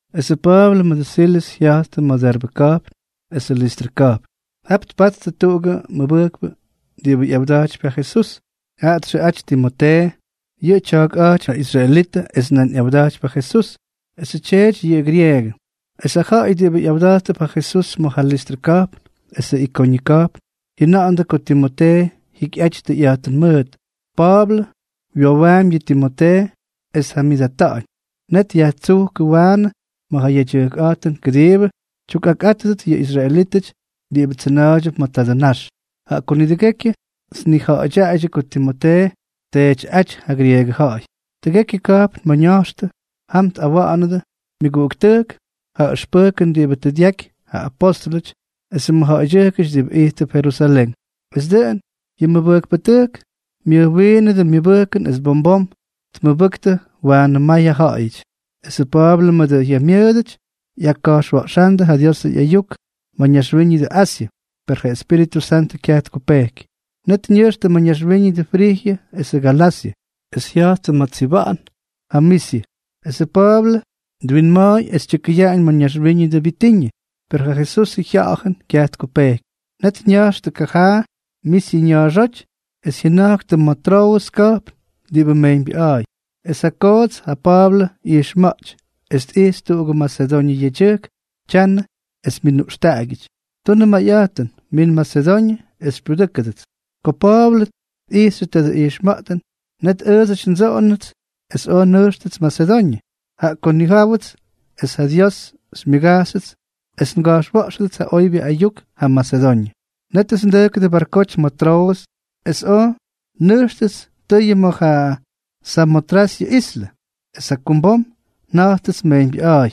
Esʉ Pa̱a̱blʉ mʉdʉ Silʉs jya̱jttʉ ma̱ Derbe ka̱jpn esʉ Listrʉ ka̱jpn. Jap tpattʉ tuꞌugʉ mʉbʉjkpʉ diꞌibʉ ꞌyawda̱jtypy yʉ Jesús. Jaꞌa txʉꞌaty Timotee. Yʉꞌʉ tya̱a̱kꞌa̱jtypy ja israelitʉ es nan ꞌyawda̱jtypy ja Jesús. Esʉ tyeety yʉꞌʉ grieegʉ. Es ja ja̱ꞌa̱y diꞌibʉ ꞌyawda̱jttʉp ja Jesús ma̱ ja Listrʉ ka̱jpn esʉ Ikoñʉ ka̱jpn jyʉna̱ꞌa̱ndʉ ko Timotee jyikyꞌaty tʉyꞌa̱jtʉn mʉʉt. Pa̱a̱blʉ wyowaampy yʉ Timotee es tjamyʉʉtꞌata̱ꞌa̱ñ. Net dyajtsujkʉ waanʉ ma̱ ja yedyʉjkꞌa̱jtʉn kʉdiibʉ tyukꞌakꞌátʉdʉt yʉ israelítʉty diꞌibʉ tsʉna̱a̱ydyʉp ma̱ tadʉ nax, jaꞌa ko nidʉgekyʉ tnija̱ꞌa̱dyaaydyʉ ko Timotee tteetyꞌáty ja grieegʉ ja̱ꞌa̱y. Tʉgekyʉ ka̱jpn ma̱ ña̱jxtʉ, jam tꞌawa̱ꞌa̱nʉdʉ myʉguꞌuktʉjk ja ʉxpʉjkʉn diꞌibʉ tʉ dyaky ja apóstʉlʉty esʉ mʉjja̱ꞌa̱ydyʉjkʉty diꞌibʉ ijttʉp Jerusalén. Es dʉꞌʉn yʉ mʉbʉjkpʉtʉjk myʉjwiinʉdʉ myʉbʉjkʉn es bom bom tmʉbʉjktʉ waanʉ may ja ja̱ꞌa̱yʉty. Esʉ Pa̱a̱blʉ mʉdʉ jyamyʉʉdʉty jyaka̱jxwa̱ꞌxándʉ ja Diosʉ ꞌyayuk ma̱ ñaxwíñʉdʉ Asyʉ, per ja Espíritʉ Santʉ kyaj tkupejky. Net ña̱jxtʉ ma̱ ñaxwíñʉdʉ Frijyʉ esʉ Galasyʉ, es jya̱jttʉ ma̱ tsyiba̱ꞌa̱n ja Misyʉ. Esʉ Pa̱a̱blʉ twinma̱a̱y es tyʉkʉyaꞌañ ma̱ ñaxwíñʉdʉ Bitiñʉ, per ja Jesusʉ Jya̱ꞌa̱jʉn kyaj tkupejky. Net ña̱jxtʉ kajaa Misyʉ ña̱a̱xóty, es jyʉna̱jktʉ ma̱ Troʉs ka̱jpn diꞌibʉ mejyñbyʉꞌa̱a̱y. Es ja koots ja Pa̱a̱blʉ ꞌyijxma̱ꞌty, es tꞌijxy tuꞌugʉ Masedoñʉ yedyʉjk tyanʉ es myʉnuꞌxtaꞌagyʉty: —Tunʉ mayꞌa̱jtʉn, min Masedoñʉ es xypyudʉ́kʉdʉts. Ko Pa̱a̱blʉ tꞌijxyʉ tadʉ ijxma̱ꞌtʉn, net ʉʉdsʉty ndsoꞌoñʉts es oj nnejxyʉts Masedoñʉ, jaꞌa ko nnijáwʉts es ja Dios xymyʉgajxyʉts es nga̱jxwa̱ꞌxʉdʉts ja oybyʉ ayuk jam Masedoñʉ. Nétʉts ndʉjkʉdʉ barkoty ma̱ Troʉs, es oj nnʉjxtʉts tʉyʉ ma̱ ja Samotrasyʉ islʉ, es jakumbom nja̱jttʉts mejyñbyʉꞌa̱a̱y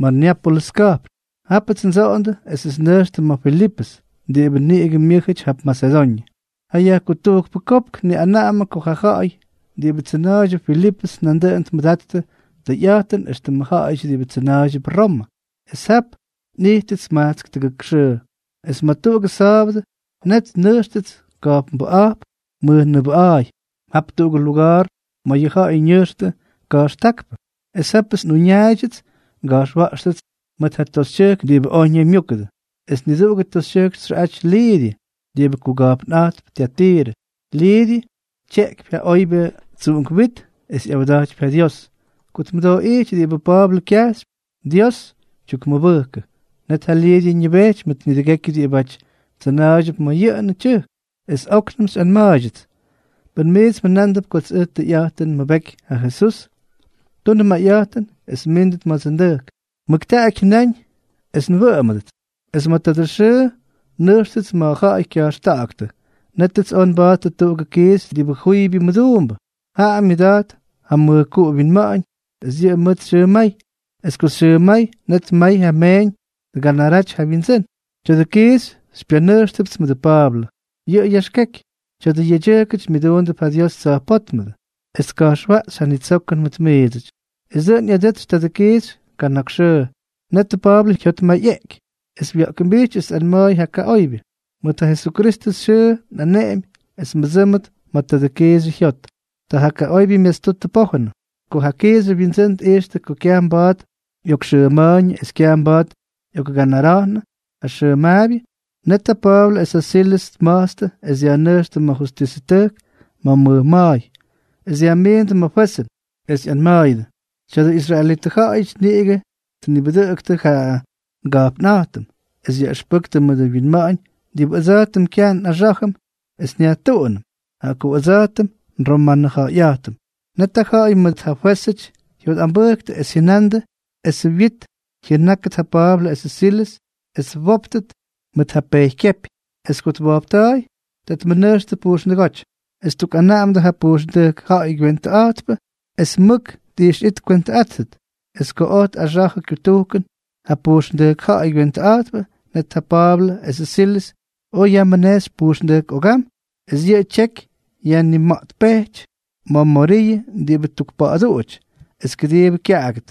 ma̱ Neápolʉs ka̱jpn. Japts ndsoꞌondʉ esʉts nnʉjxtʉ ma̱ Filipʉs, diꞌibʉ niꞌigʉ myʉ́jʉty jap Masedoñʉ. Ja yajkutujkpʉ kopk tniꞌanaꞌamʉ ko ja ja̱ꞌa̱y diꞌibʉ tsʉna̱a̱ydyʉp Filipʉs nandʉꞌʉn tmʉdattʉ tʉyꞌa̱jtʉn éxtʉmʉ ja̱ꞌa̱yʉty diꞌibʉ tsʉna̱a̱ydyʉp Romʉ. Es jap nꞌijttʉts majtsk tʉgʉk xʉʉ. Es ma̱ tuꞌugʉ sa̱a̱bʉdʉ, net nnʉjxtʉts ka̱jpnbʉꞌa̱jp mʉjnʉʉbʉꞌa̱a̱y. Jap tuꞌugʉ luga̱a̱r ma̱ yʉ ja̱ꞌa̱y ñʉjxtʉ ka̱jxtákpʉ. Es jápʉts nꞌuñaaydyʉts nga̱jxwa̱ꞌxtʉts mʉt ja toxytyʉjk diꞌibʉ oj ñaymyúkʉdʉ. Es niduꞌugʉ toxytyʉjk txʉꞌaty Lidyʉ, diꞌibʉ kuga̱jpnꞌa̱jtp Tyatirʉ. Lidyʉ tyeꞌkypy ja oybyʉ tsuꞌunk wit es ꞌyawda̱jtypy ja Dios. Ko tmʉdooꞌíty diꞌibʉ Pa̱a̱blʉ kyajxypy, Dios tyukmʉbʉjkʉ. Net ja Lidyʉ ñʉbejty mʉt nidʉgekyʉ diꞌibáty tsʉna̱a̱ydyʉp ma̱ jyʉʉn tyʉjk, es óknʉmts xyꞌanma̱a̱ydyʉts: —Pʉn miits mjʉnándʉp kots ʉj tʉyꞌa̱jtʉn nmʉbeky ja Jesús, tunʉ mayꞌa̱jtʉn es mmíndʉt ma̱dsʉ ndʉjk. —Mʉktaꞌaky jyʉnáñ es nwʉꞌʉmdʉts. Es ma̱ tuꞌugʉ xʉʉ nnʉjxtʉts ma̱ ja̱ꞌa̱y kya̱jxta̱ꞌa̱ktʉ, nétʉts oj nba̱a̱ttʉ tuꞌugʉ kiixy diꞌibʉ juybyʉ mʉduumbʉ. Jaꞌa myʉda̱jt ja mʉjkuꞌu wyinma̱ꞌa̱ñ es yʉꞌʉ mʉt xyʉmay. Es ko xyʉmay, net may ja meeñ tganaraty ja wyindsʉ́n. Tya̱dʉ kiixy xypyanʉjxtʉpts mʉdʉ Pa̱a̱blʉ, yʉꞌʉ yaxkeky: —Tya̱dʉ yedyʉjkʉty myʉduundʉp ja Dios Tsa̱jpótmʉdʉ, es tka̱jxwaꞌxy ja nitsokʉn mʉt miidsʉty. Es dʉꞌʉn ꞌyadʉtsy tadʉ kiixy kana̱k xʉʉ. Netʉ Pa̱a̱blʉ jyotmayꞌeꞌky, es wya̱ꞌkʉmbijty es tꞌanma̱a̱y ja kaꞌoybyʉ: —Mʉt ja Jesukristʉ xyʉʉ nꞌaneꞌemy es mbʉdsʉ́mʉt ma̱ tadʉ kiixyʉ jyot. Ta ja kaꞌoybyʉ myastutʉ pojʉn. Ko ja kiixyʉ wyindsʉ́n tꞌijxtʉ ko kyaj mba̱a̱t ꞌyokxʉma̱a̱yñʉ es kyaj mba̱a̱t ꞌyokganara̱jnʉ ja xʉmaabyʉ, net ja Pa̱a̱blʉ es ja Silʉs tma̱jtstʉ es dyajnʉjxtʉ ma̱ justisʉtʉjk ma̱ mʉj ma̱a̱y. Es dyajmiindʉ ma̱ fwezʉn, es ꞌyanma̱a̱yʉdʉ: —Tya̱dʉ israelitʉ ja̱ꞌa̱yʉty niꞌigʉ tnibʉdʉꞌʉktʉ ja nga̱jpnꞌa̱jtʉm, es yaꞌʉxpʉktʉ mʉdʉ wyinma̱ꞌa̱ñ diꞌibʉ ʉdsa̱jtʉm kyaj nꞌaxá̱jʉm es nyajtuꞌunʉm, jaꞌa ko ʉdsa̱jtʉm nromanʉja̱ꞌa̱yꞌa̱jtʉm. Net ja ja̱ꞌa̱y mʉt ja fwézʉty jyotꞌambʉjktʉ, es jyʉnandʉ esʉ wyit jyʉnákʉt ja Pa̱a̱blʉ esʉ Silʉs es twóptʉt mʉt ja pejykyepy. Es ko twojpta̱a̱y, ta tmʉnʉjxtʉ pujxndʉgóty, es ttukꞌanaꞌamʉdʉ ja pujxndʉjk ja̱ꞌa̱y kywentʉꞌa̱jtpʉ es mʉk tꞌixyꞌit tkwentʉꞌáttʉt. Es ko oj tꞌaxa̱jʉ kyutujkʉn ja pujxndʉjk ja̱ꞌa̱y kywentʉꞌa̱jtpʉ, net ja Pa̱a̱blʉ esʉ Silʉs oj yajmʉnejxy pujxndʉjk ogam es yʉ tyeky yajnimaꞌtpejty ma̱ moriyʉ diꞌibʉ tukpa̱ꞌa̱duꞌuty es kʉdiibʉ kyaꞌagʉt.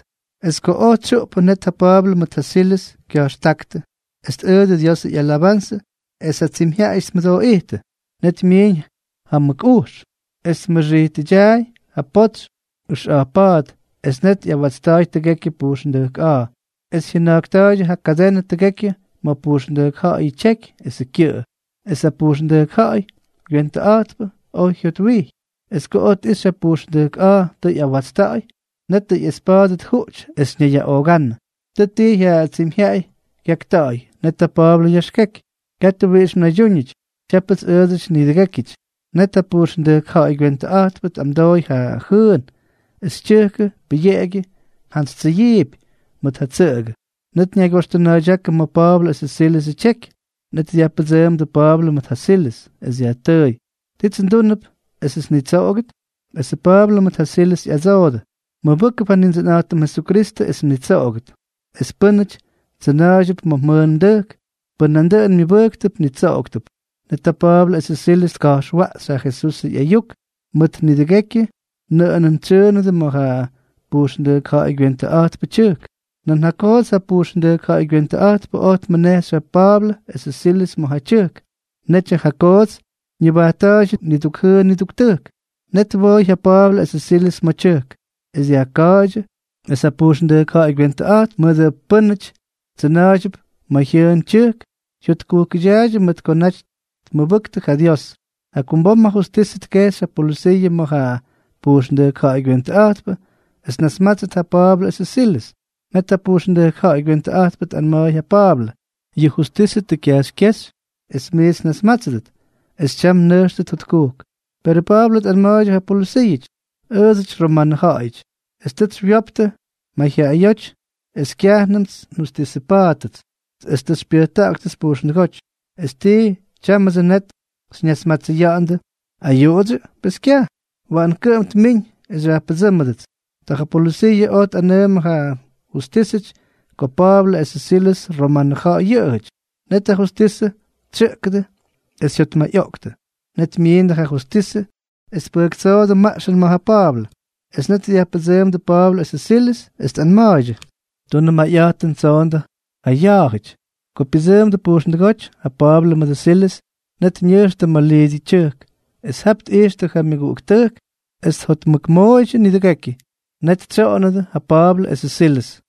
Es ko oj tsyuꞌpʉ, net ja Pa̱a̱blʉ mʉt ja Silʉs kya̱jxtáktʉ es tꞌʉʉdʉ Diosʉ ꞌyalabanzʉ, es ja tsimyjyaꞌayʉty tmʉdooꞌijttʉ. Net myiiñ ja mʉk ujx, es tmʉxijtʉdyaay ja potsy ʉxꞌa̱jp pa̱a̱t. Es net ꞌyawatsta̱a̱y tʉgekyʉ pujxndʉjk a̱a̱, es jyʉna̱jkta̱a̱y ja kadenʉ tʉgekyʉ ma̱ pujxndʉjk ja̱ꞌa̱yʉ tyeky esʉ kyʉꞌʉ. Es ja pujxndʉjk ja̱ꞌa̱y kywentʉꞌa̱jtpʉ oj jyotwijy. Es ko tꞌijxy ja pujxndʉjk a̱a̱ tʉ ꞌyawatsta̱ꞌa̱y, netʉ ꞌyespa̱a̱dʉ tjuꞌty es ñayyaꞌoogánʉ. Tʉ ttijy ja tsimyjyaꞌay kyakta̱ꞌa̱y. Net ja Pa̱a̱blʉ yaxkeky: —¡Katʉ wiꞌix mnaydyúñʉty! Tyápʉts ʉʉdsʉty nidʉgékyʉty. Net ja pujxndʉjk ja̱ꞌa̱y kywentʉꞌa̱jtpʉ tꞌamdooy ja jʉʉn, es tyʉjkʉ pʉyeꞌegyʉ jyantsytsyʉyiipy mʉt ja tsʉꞌʉgʉ. Net ñaygyoxtʉna̱a̱ydyákʉ ma̱ Pa̱a̱blʉ esʉ Silʉsʉ tyeky. Net dyajpʉdsʉʉmdʉ Pa̱a̱blʉ mʉt ja Silʉs, es dyajtʉʉy: —¿Tits ndúnʉp esʉts nnitsoꞌogʉt? Esʉ Pa̱a̱blʉ mʉt ja Silʉs ꞌyadsoodʉ: —Mmʉbʉ́kʉp ja Nindsʉnꞌa̱jtʉm Jesukristʉ, es mnitsoꞌogʉt. Es pʉ́nʉty tsʉna̱a̱ydyʉp ma̱ mjʉʉn mdʉjk, pʉn nandʉꞌʉn myʉbʉjktʉp, nitsoꞌoktʉp. Net ja Pa̱a̱blʉ esʉ Silʉs tka̱jxwaꞌxy ja Jesusʉ ꞌyayuk mʉt nidʉgekyʉ nʉꞌʉnʉn tsyʉʉnʉdʉ ma̱ ja pujxndʉjk ja̱ꞌa̱y kywentʉꞌa̱jtpʉ tyʉjk. Nan ja koots ja pujxndʉjk ja̱ꞌa̱y kywentʉꞌa̱jtpʉ oj tmʉnejxy ja Pa̱a̱blʉ esʉ Silʉs ma̱ ja tyʉjk. Netyʉ ja koots ñʉbajtta̱a̱ydyʉ niduk jʉʉn niduk tʉjk. Net twooy ja Pa̱a̱blʉ esʉ Silʉs ma̱ tyʉjk, es dyajka̱a̱ydyʉ, es ja pujxndʉjk ja̱ꞌa̱y kywentʉꞌa̱jtpʉ mʉdʉ pʉ́nʉty tsyʉna̱a̱ydyʉp ma̱ jyʉʉn tyʉjk jyotkujkʉdyaaydyʉ mʉt ko naty tmʉbʉktʉ ja Dios. Jakumbom ja justisʉ tkejxy ja polʉsiiʉ ma̱ ja pujxndʉjk ja̱ꞌa̱y kywentʉꞌa̱jtpʉ, es tnasmátsʉt ja Pa̱a̱blʉ esʉ Silʉs. Net ja pujxndʉjk ja̱ꞌa̱y kywentʉꞌa̱jtpʉ tꞌanma̱a̱y ja Pa̱a̱blʉ: —Yʉ justisʉ tʉ kyajxykyéxy es miits nnasmátsʉdʉt. Es tyam mnʉjxtʉt jotkujk. Perʉ Pa̱a̱blʉ tꞌanma̱a̱ydyʉ ja polʉsiiʉty: —Ʉʉdsʉty romanʉ ja̱ꞌa̱yʉty. Es tʉts xywyoptʉ mayjyaꞌayóty es kyajnʉmts xyajjustisʉpa̱a̱ttʉts, es tʉ xypyʉjta̱ꞌa̱ktʉts pujxndʉgóty. ¿Es tii, tyámʉdsʉ net xyñasmatsʉya̱ꞌa̱ndʉ ayuꞌudsyʉ? ¡Pes kyaj! Waꞌan kʉꞌʉm tmiñ es xyajpʉdsʉ́mʉdʉts. Ta ja polʉsiiʉ oj tꞌanʉʉmʉ ja justísʉty ko Pa̱a̱blʉ esʉ Silʉs romanʉ ja̱ꞌa̱y yʉꞌʉjʉty. Net ja justisʉ tsyʉꞌkʉdʉ es jyotmayꞌoꞌktʉ. Net myiindʉ ja justisʉ es tpʉjktsoodʉ maꞌxʉn ma̱ ja Pa̱a̱blʉ. Es net dyajpʉdsʉʉmdʉ Pa̱a̱blʉ esʉ Silʉs, es tꞌanma̱a̱ydyʉ: —Tunʉ mayꞌa̱jtʉn, tsoondʉ ja ya̱a̱jʉty. Ko pyʉdsʉʉmdʉ pujxndʉgóty ja Pa̱a̱blʉ mʉdʉ Silʉs, net ñʉjxtʉ ma̱ Lidyʉ tyʉjk. Es jap tꞌijxtʉ ja myʉguꞌuktʉjk, es tjotmʉkmooydyʉ nidʉgekyʉ. Net tsyoꞌonnʉdʉ ja Pa̱a̱blʉ esʉ Silʉs.